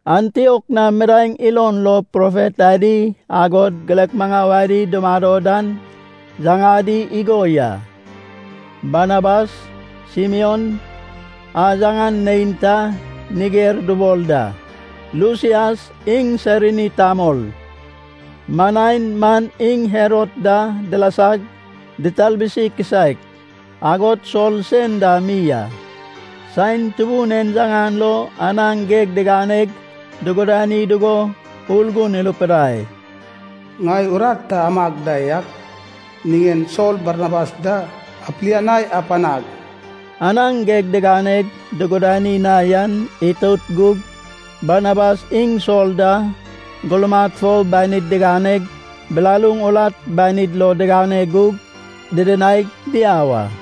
Antiok na midaeŋ ilon lo profet adi, agod girek maŋau adi dumado dan yaŋadi igo ya: Barnabas, Simion a yaŋan neinta Niger dubol da. Lusias iŋ Sairini tamol. Manain man iŋ Herod da dilasag ditalbusi kisaek. Agod Sol sen dam mi a. Saen Tubun en yaŋan lo anaŋ geg diganeg dugudani dugo Urgun irupidai, “Ŋai urat ta amag da yak niŋen Sol Barnabas da apilianai apanag.” Anaŋ geg diganeg dugudani na yan itout gug Barnabas iŋ Sol da gurmad fo banid diganeg bilaluŋ urat banid lo digane gug didinaig diau a.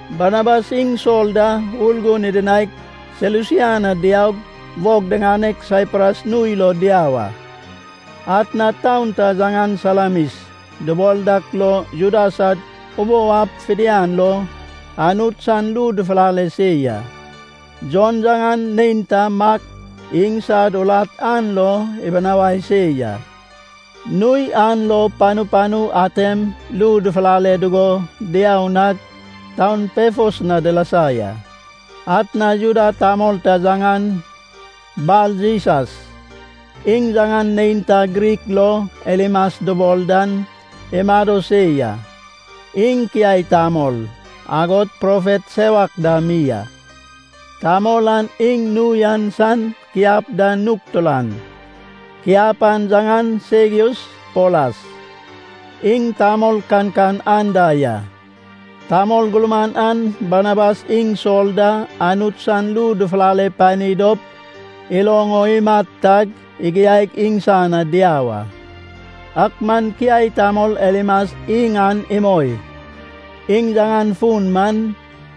Barnabas iŋ Sol da Urgun idinaig Selusia na diaug wog diŋaneg Saipras nui lo diau a. Atna taun ta yaŋan Salamis dubol dak lo Juda sad ubou ab fidian lo Anut san ru dufulale se ya. Jon yaŋan neinta Mak, iŋsad urat an lo ibinawai se ya. Nui an lo panu panu atem ru dufulale dugo diau nag taun Pefos na dilasa ya. Atna Juda tamol ta yaŋan Bar-Jisas, iŋ yaŋan neinta Grik lo Elimas dubol dan, imado se ya. Iŋ kiai tamol, agod profet sewak dam mi a. Tamol an iŋ nui an san kiap da nug turan. Kiap an yaŋan Segius Polas, iŋ tamol kankan anda ya. Tamol gurman an Barnabas iŋ Sol da Anut san ru dufulale pani dop iloŋ o imat tag igiaig iŋsan na diau a. Ak man kiai tamol Elimas iŋ an imoi. (Iŋ yaŋan fun man: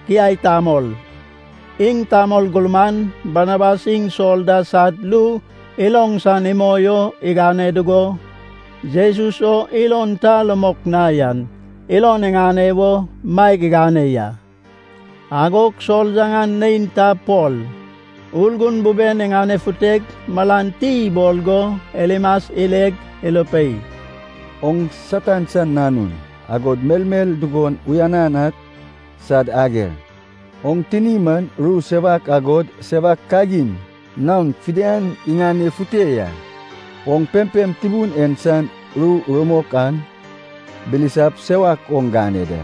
kiai tamol.) Iŋ tamol gurman Barnabas iŋ Sol da sad ru iloŋ san imoi o igane dugo, Jesus o ilon ta rumok na yan ilon iŋane wo maeg igane ya. Agog Sol yaŋan neinta Pol, Urgun buben iŋanefuteg malan ti ibol go Elimas ileg, irupei, “Oŋ Satan san nanun, agod melmel dugon uyanan ak sad ager! Oŋ tini man ru sewak agod sewak kagin naon fidian iŋanefute ya. Oŋ pempem Tubun en san ru rumok an bilisap sewak oŋ gane da.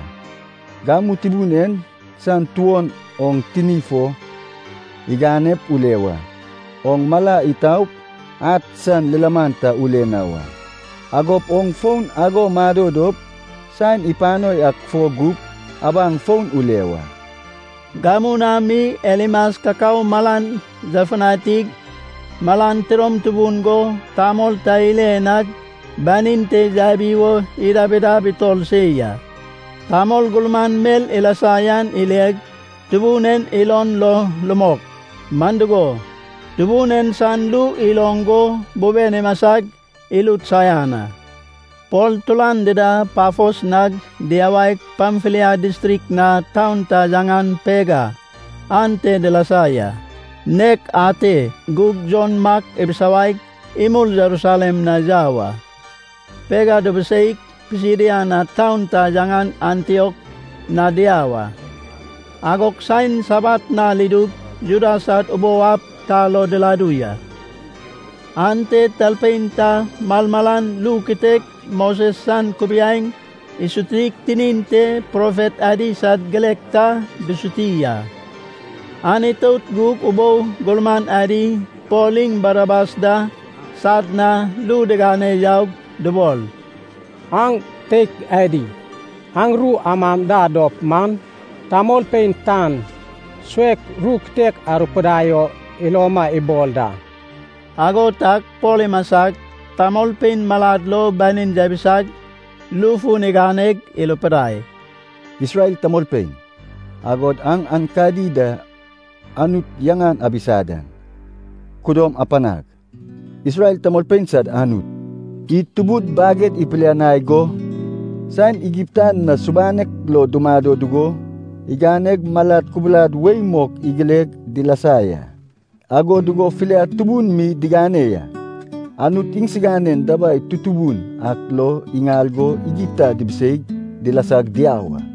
Gamu Tubun en san tuon oŋ tini fo iganep ule wa. Oŋ mala itaup ad san lilaman ta ule na wa. Agop oŋ ago mado dop saen ipano yak fo gup abaŋ fon ule wa.” Gamu na mi Elimas kakao malan yafutanig, malan tidom tubun go tamol ta ile nag banin te yabi wo idab idab itor se ya. Tamol gurman mel ilasa yan ileg, Tubun en ilon lo rumok. Man dugo, Tubun en san ru iloŋ go buben imasag irut saian a. Pol turan dida Pafos nag diyawaig, Pamfilia distrik na taun ta yaŋan Pega ante dilasa ya. Nek ate gug Jon Mak ibisawaig imul Jerusalem na yau a. Pega dubuseig Pisidia na taun ta yaŋan Antiok na diau a. Agog saen Sabat nal idug Juda sad ubou ab ta lo diladu ya. Ante talpein ta malmalan ru kitek Moses san kubiaeŋ isutig tinin te profet adi sad girek ta dusuti a. An itout gug ubou gurman adi Pol iŋ Barnabas da sad na ru digane yaug dubol, “Aŋ teik adi, aŋ ru amam da dop man, tamolpein tan suek ru kitek arupidai o iloma ibol da.” Ago tag Pol imasag, tamolpein malad lo banin yabisag, ru fun iganeg irupidai, “Isrel tamolpein, agod aŋ aenkadi da Anut yaŋan abisa dan, kududom apanag! Isrel tamolpein sad Anut, id tubud baged ipilianai go, saen Igipta na subanek lo dumado dugo, iganeg malad kubulad wei mok igileg dilasa ya, ago dugo filiad tubun mi diŋane ya. Anut iŋsiganen dabai tutubun ak lo iŋal go Igipta dibiseig dilasag diau a.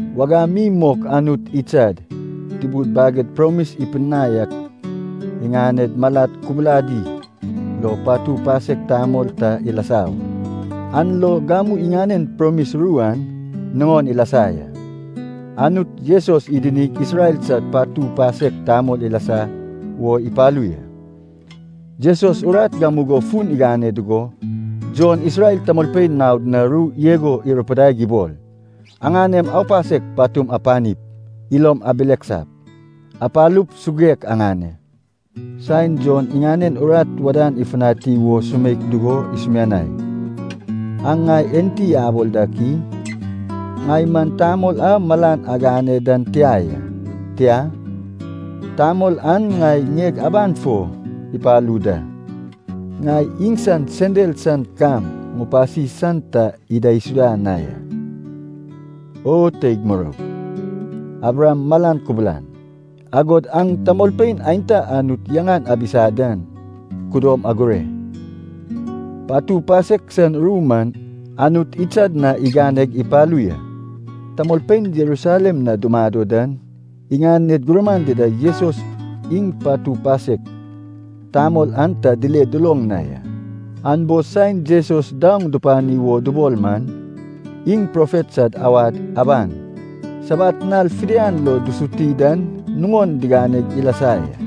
“Wagam mi mok Anut idsad tubud baged promis ipidinai ak iŋaned malad kubuladi lo patu pasek tamol ta ilasa wa. An lo gamu iŋanen promis ru an nuŋon ilasa ya, Anut Jesus idinig Isrel sad patu pasek tamol ilasa wo ipalu ya. Jesus urat gamugo fun igane dugo, Jon Isrel tamolpein naod na ru igo irupidaig ibol, ‘Aŋanem aupasek patum apanip, ilom abileksap, apalup suguek aŋane.’ Saen Jon iŋanen urat wadan ifutani wo sumeik dugo isumianai, ‘Aŋ ŋai enti abol dak i? Ŋai man tamol a malan agane dan tia ya. Tia, tamol an ŋai ŋieg aban fo ipalu da. Ŋai iŋsan sendal san kam ŋupasi san ta idaisuda na ya.’ “O teig muroug, Abraham malan kubulan, agod aŋ tamolpein aenta Anut yaŋan abisa dan kudom agure. Patu pasek san ru man Anut idsad na iganeg ipalu ya. Tamolpein Jerusalem na dumado dan, iŋaned gurman dida Jesus iŋ patu pasek tamol an ta dile duloŋ na ya. An bo saen Jesus daoŋ dupani wo dubol man, iŋ profet sad awad aban Sabat nal fidian lo dusuti dan nuŋon diganeg ilasa ya.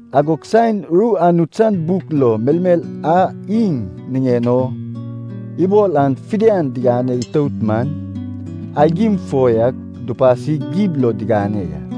Agog saen ru Anut san buk lo melmel a iŋ niŋen o ibol an fidian digane itout man, aigim fo yak dupasig gib lo digane ya.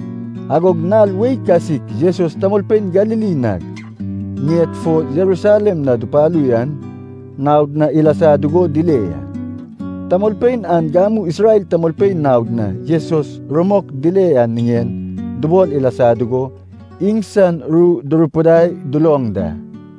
Agog nal wei kasik Jesus tamolpein Galili nag ŋien fo Jerusalem na dupalu yan naod na ilasa dugo dile ya. Tamolpein an gamu Isrel tamolpein naod na Jesus rumok dile yan niŋen dubol ilasa dugo iŋsan ru durupidai duloŋ da.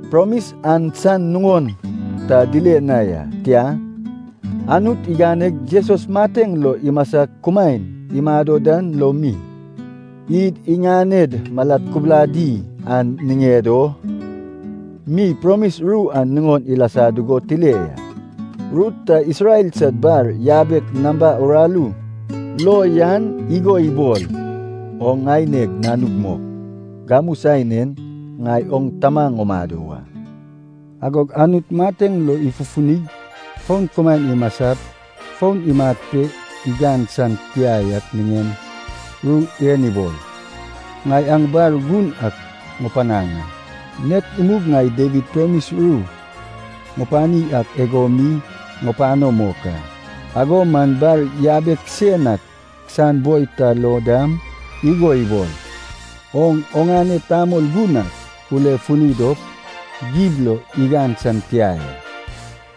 Promis an san nuŋon ta dile na ya, tia, Anut iganeg Jesus mateŋ lo imasag kumaen imado dan lo mi, id iŋaned malad kubuladi an niŋed o mi promis ru an nuŋon ilasa dugo tile ya. Ru ta Isrel sad bar yabek namba uraru lo yan igo ibol, ‘Oŋ ŋaineg Nanug mok; Gamu saen en ŋai oŋ Tama ŋumado wa.’ Agog Anut mateŋ lo ifufunip, fon kumaen imasap, fon imat pe igan san tia yak niŋen ru en ibol, ‘Ŋai aŋ bar gun ak ŋupanaŋ a. Nek imug ŋai Dawid promis ru ŋupani ak ago mi ŋupano mok a.’ Ago man bar yabek sen ak san boi ta lo dam igo ibol, ‘Oŋ oŋane Tamol Gun ak ulefuni dop gib lo igan san tia ya.’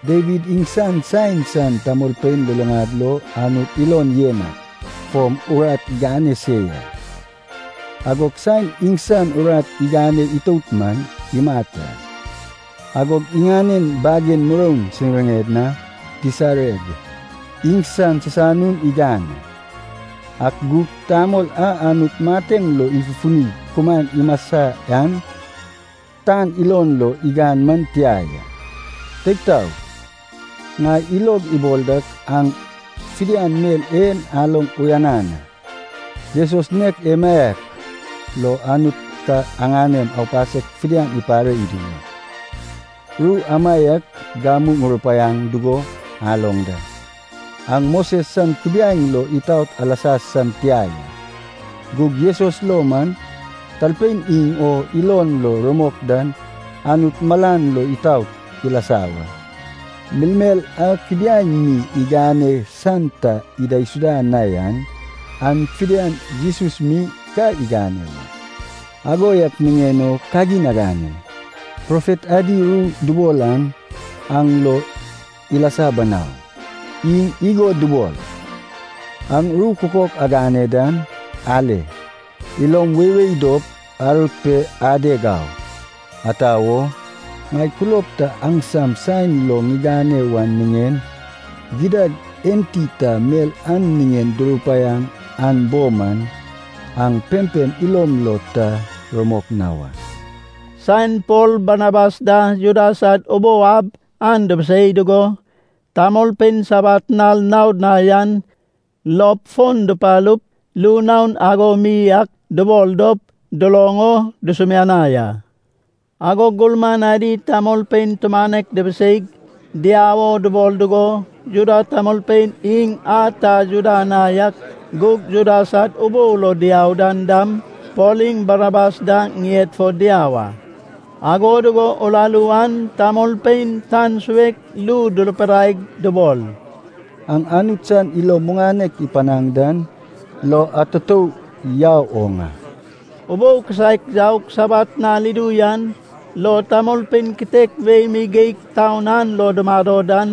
“Dawid iŋsan saen san tamolpein luluŋad lo Anut ilon yen ak fom urat igane se ya, agog saen iŋsan urat igane itout man, imat a. Agog iŋanen bagen muroun siŋired na disareg, iŋsan sisanun igan a. Ak gug tamol a Anut mateŋ lo ifufunig kumaen imasa yan, tan ilon lo igan man tia ya. “Teig taog, ŋai ilog ibol dak aŋ fidian mel en aloŋ uyanan a. Jesus nek emaiak lo Anut ka aŋanem aupasek fidian ipare idu wa, ru amaiak gamu murupaiaŋ dugo aloŋ da. Aŋ Moses san kubiaeŋ lo itaot alasa san tia ya. Gug Jesus lo man, talpein iŋ o ilon lo rumok dan Anut malan lo itaot ilasa wa. Melmel a kubiaeŋ mi igane san ta idaisuda na yan, an fidian Jesus mi ka igane wa. Ago yak niŋen o kagin agane. Profet adi ru dubol an aŋ lo ilasa banau. Iŋ igo dubol, ‘Aŋ ru kukok agane dan, ale. Ilom weiwei dop arut pe adeg au. Ata wo? Ŋai kulob ta aŋsam saen lo ŋigane wan niŋen, gidad enti ta mel an niŋen durupaiaŋ an bo man, aŋ pempem ilom lo ta rumok na wa.’” Saen Pol Barnabas da Juda sad ubou ab an dubusei dugo, tamolpein Sabat nal naod na yan lop fon dupalup ru naon ago mi ak dubol dop duloŋ o dusumianai a. Agog gurman adi tamolpein tumanek dibiseip diau o dubol dugo, Juda tamolpein, iŋ a ta Juda na yak gug Juda sad ubou lo diau dan dam, Pol iŋ Barnabas da ŋied fo diau a. Ago dugo uraru an tamolpein tan suek ru durupidaig dubol, “Aŋ Anut san ilo muŋanek ipanaŋ dan lo atutou yau oŋ a.” Ubou kisaek yaug Sabat nal idu yan lo tamolpein kitek wei mi geig taun an lo dumado dan,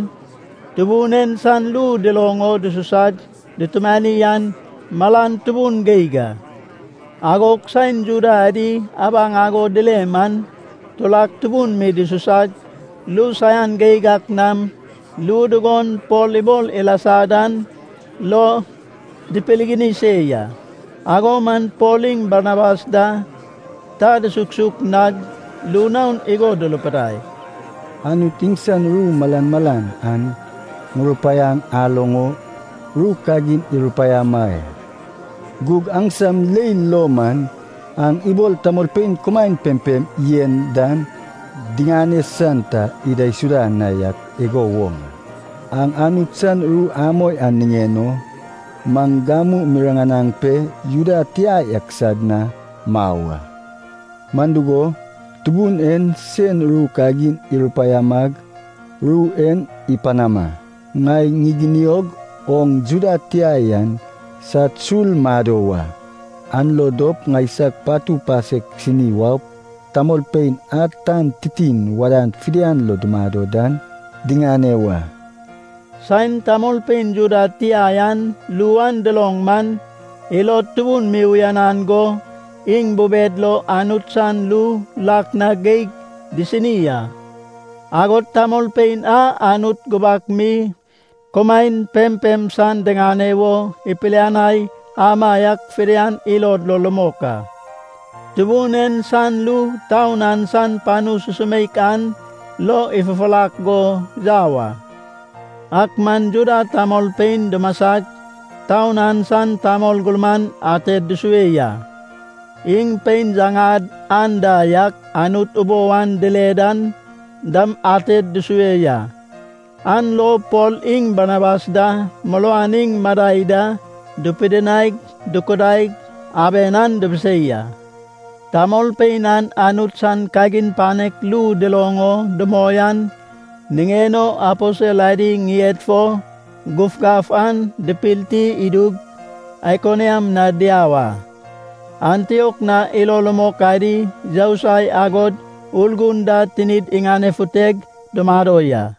Tubun en san ru duloŋ o dususag dutumani an malan tubun geig a. Agog saen Juda adi abaŋ ago dile man, turak tubun mi dususag ru saian geig ak nam ru dugon Pol ibol ilasa dan lo dipirgini se ya. Ago man Pol iŋ Barnabas da ta dusuksuk nag ru naon igo durupidai, “Anut iŋsan ru malmalan aŋ murupaiaŋ aloŋ o ru kagin irupaiama ya, gug aŋsam leil lo man aŋ ibol tamolpein kumaen pempem yen dan diŋane san ta idaisuda na yak igo woŋ a. Aŋ Anut san ru amoi an niŋen o, maŋ gamu miriŋanaŋ pe Juda tia yak sad na mau a. Man dugo, Tubun en sen ru kagin irupaiamag ru en ipanama, ‘Ŋai ŋiginiog oŋ Juda tia yan sad sul mado wa. An lo dop ŋaisag patu pasek sini waup, tamolpein a tan titin wadan fidian lo dumado dan diŋane wa.’” Saen tamolpein Juda tia yan ru an duloŋ man, ilod tubun mi uyanan go, iŋ bubed lo Anut san ru lak na geig disini a. Agod tamolpein a Anut gubak mi kumaen pempem san diŋane wo ipilianai amaiak fidian ilod lo rumok a. Tubun en san ru taun an san panu susumeik an lo ifufurak go yau a. Ak man Juda tamolpein dumasag, taun an san tamol gurman ated dusue ya. Iŋ pein yaŋad anda yak Anut ubou an dile dan dam ated dusue ya. An lo Pol iŋ Barnabas da muruan iŋ madai da dupidinaig dukudaig, aben an dibisei a. Tamolpein an Anut san kagin panek ru duloŋ o dumoi an niŋen o, aposel adi ŋied fo gufgaf an dipilti idug, Aikoniam na diau a. Antiok na ilo rumok adi yousai agod Urgun da tinid iŋanefuteg dumado ya.